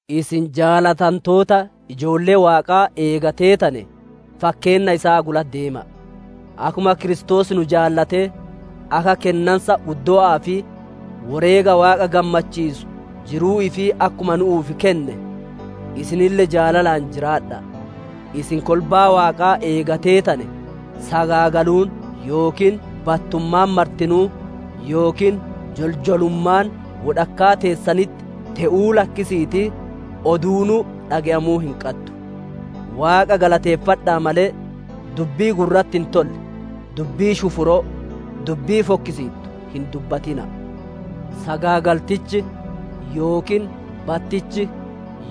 Isin jaalatantoota ijoollee Waaqaa eega teetanee, fakkeenna isaa gula deema'a. Akkuma Kiristoos nu jaalatee, akka kennansa uddowa'aa fi woreega Waaqa gammachiisuu, jiruu ifii akkuma nu'uuf kenne, isinille jaalalaan jiraadha'a. Isin kolbaa Waaqaa eega teetanee, sagaagaluun yookiin battummaan martinuu yookiin joljolummaan wodhakkaa teessanitti te'uu lakkisiitii, oduunuu dhage'amuu hin qaddu. Waaqa galateeffadha'a malee, dubbii gurratti hin tolle, dubbii shufuroo, dubbii fokkisiittu hin dubbatina'a. Sagaagaltichi, yookiin battichi,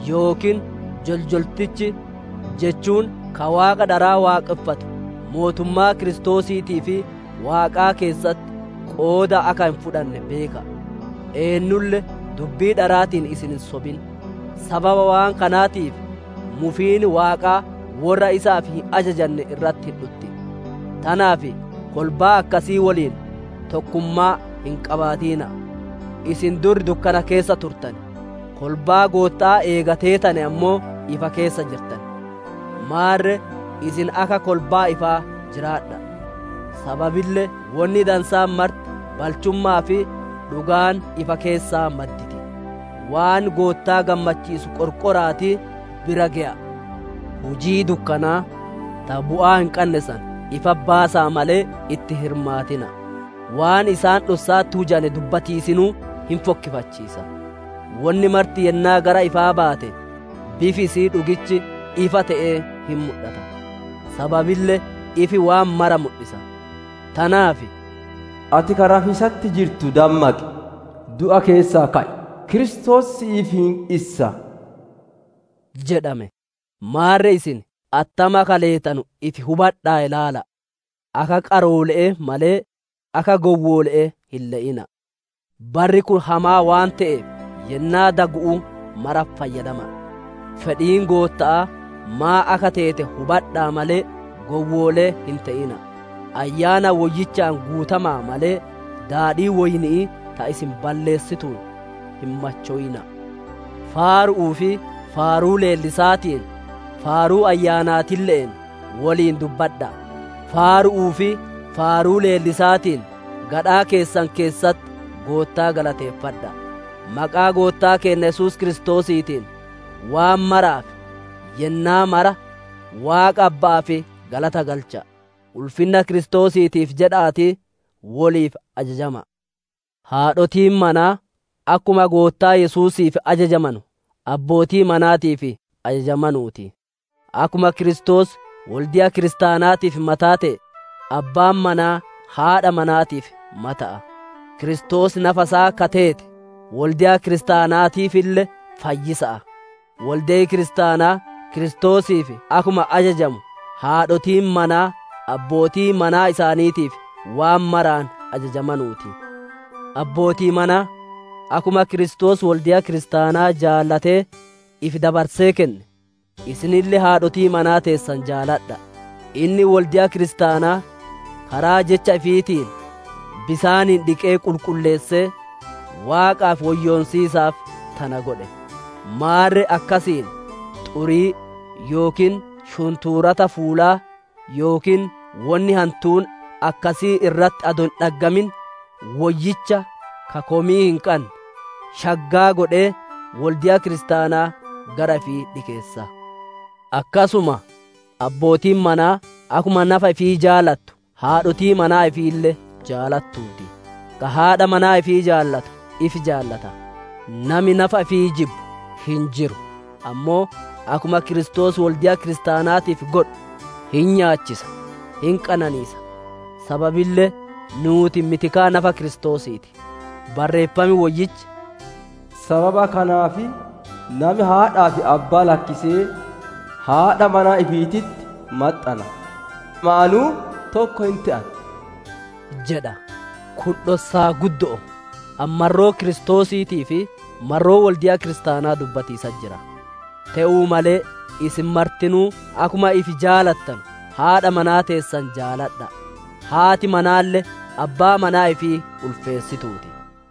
yookiin joljoltichi jechuun ka waaqa dharaa waaqonfatu mootummaa Kiristoosiitii fi Waaqaa keessatti qooda akka hin fudhanne beeka'a. Eennulle dubbii dharaatiin isin hin sobin; sababa waan kanaatiif mufiin Waaqaa worra isaaf hin ajajanne irratti hin dhutti. Tanaaf kolbaa akkasii woliin tokkummaa hin qabaatina'a. Isin dur dukkana keessa turtane, kolbaa Gootta'aa eega teetane ammoo, ifa keessa jirtan. Maarre isin akka kolbaa ifaa jiraadha'a. Sababille wonni dansaan marti, balchumma'aa fi dhugaan ifa keessaa madditi. Waan Goottaa gammachiisu qorqora'aatii bira geya'a. Hujii dukkanaa, ta bu'aa hin qanne san, ifatti baasa'a malee, itti hin hirmaatina'a. Waan isaan dhossa'atti hujanee dubbatiisinuu hin fokkifachiisa. Wonni marti yennaa gara ifaa baate, bifi isi'ii dhugichi ifa te'ee hin mudhata; Sababille ifi waan mara mudhisa. Tanaaf, «Ati ka rafiisatti jirtu, dammaqi! Du'a keessaa ka'i! Kiristoos si'iif hin issa» jedhame. Maarre isin attam akka leetanu ifi hubadha'aa ilaalladha'a. Akka qaroole'ee malee, akka gowwoole'ee hin le'ina'a. Barri kun hamaa waan te'eef, yennaa dagu'uu maratti fayyadama'a. Fedhiin Gootta'aa maan akka teete hubadha'a malee, gowwoolee hin te'ina'a. Ayyaana Woyyichaan guutama'a malee, daadhii woyni'ii ta isin balleessituun, hin machowina'a. Faaru'uu fi faaruu leellisaatiin, faaruu Ayyaanaatille'een woliin dudubbadha'a; faaru'uu fi faaruu leellisaatiin gadhaa keessan keessatti Goottaa galateeffadha'a. Maqaa Goottaa keenna Yesuus Kiristoosiitiin, waan maraaf, yennaa mara, Waaqa Abba'aaf galata galcha'a. Ulfinna Kiristoosiitiif jedha'aatii woliif ajajama'a. Haadhotiin manaa, akkuma Goottaa Yesuusiif ajajamanu abbootii manaatiif ajajamanuu ti. Akkuma Kiristoos wolde'a kiristaanaatiif mataa te'e, abbaan manaa haadha manaatiif mata'a; Kiristoos nafa isaa ka teete, wolde'a kiristaanaatiifille fayyisa'a. Wolde'i kiristaanaa Kiristoosiif akkuma ajajamu haadhotiin manaa abbootii manaa isaaniitiif waan maraan ajajamanuu ti. Abbootii manaa! Akkuma Kiristoos wolde'a kiristaanaa jaalatee ifi dabarsee kenne, isinille haadhotii manaa teessan jaaladha'a. Inni wolde'a kiristaanaa karaa Jecha ifiitiin bisaaniin dhiqee qulqulleessee, Waaqaaf woyyoonsiisaaf tana godhe. Maarre akkasiin xurii yookiin shuntuurata fuulaa yookiin wonni hantuun akkasii irratti adoo hin dhaggamin, Woyyicha, ka komii hin qanne, shaggaa godhee, wolde'a kiristaanaa gara ifii dhikeessa. Akkasuma, abbootiin manaa akkuma nafa ifii jaalattu haadhotii manaa ifiille jaalatuu ti. Ka haadha manaa ifii jaalatu ifi jaalata. Nami nafa ifii jibbu hin jiru; ammoo akkuma Kiristoos wolde'a kiristaanaatiif godhu, hin nyaachisa, hin qananiisa. Sababille nuuti mitikaa nafa Kiristoosii ti. Barreeffam Woyyichi, «Sababa kanaaf nami haadhaa fi abbaa lakkisee, haadha manaa ifiititti maxxana; lamaanuu tokko hin te'an» jedha. Kun dhossaa guddo'o; ani marroo Kiristoosiitii fi marroo wolde'a kiristaanaa dubbatiisatti jira. Te'uu malee, isin martinuu akkuma ifi jaalattanu haadha manaa teessan jaaladha'a; haati manaalle abbaa manaa ifii ulfeessituu ti.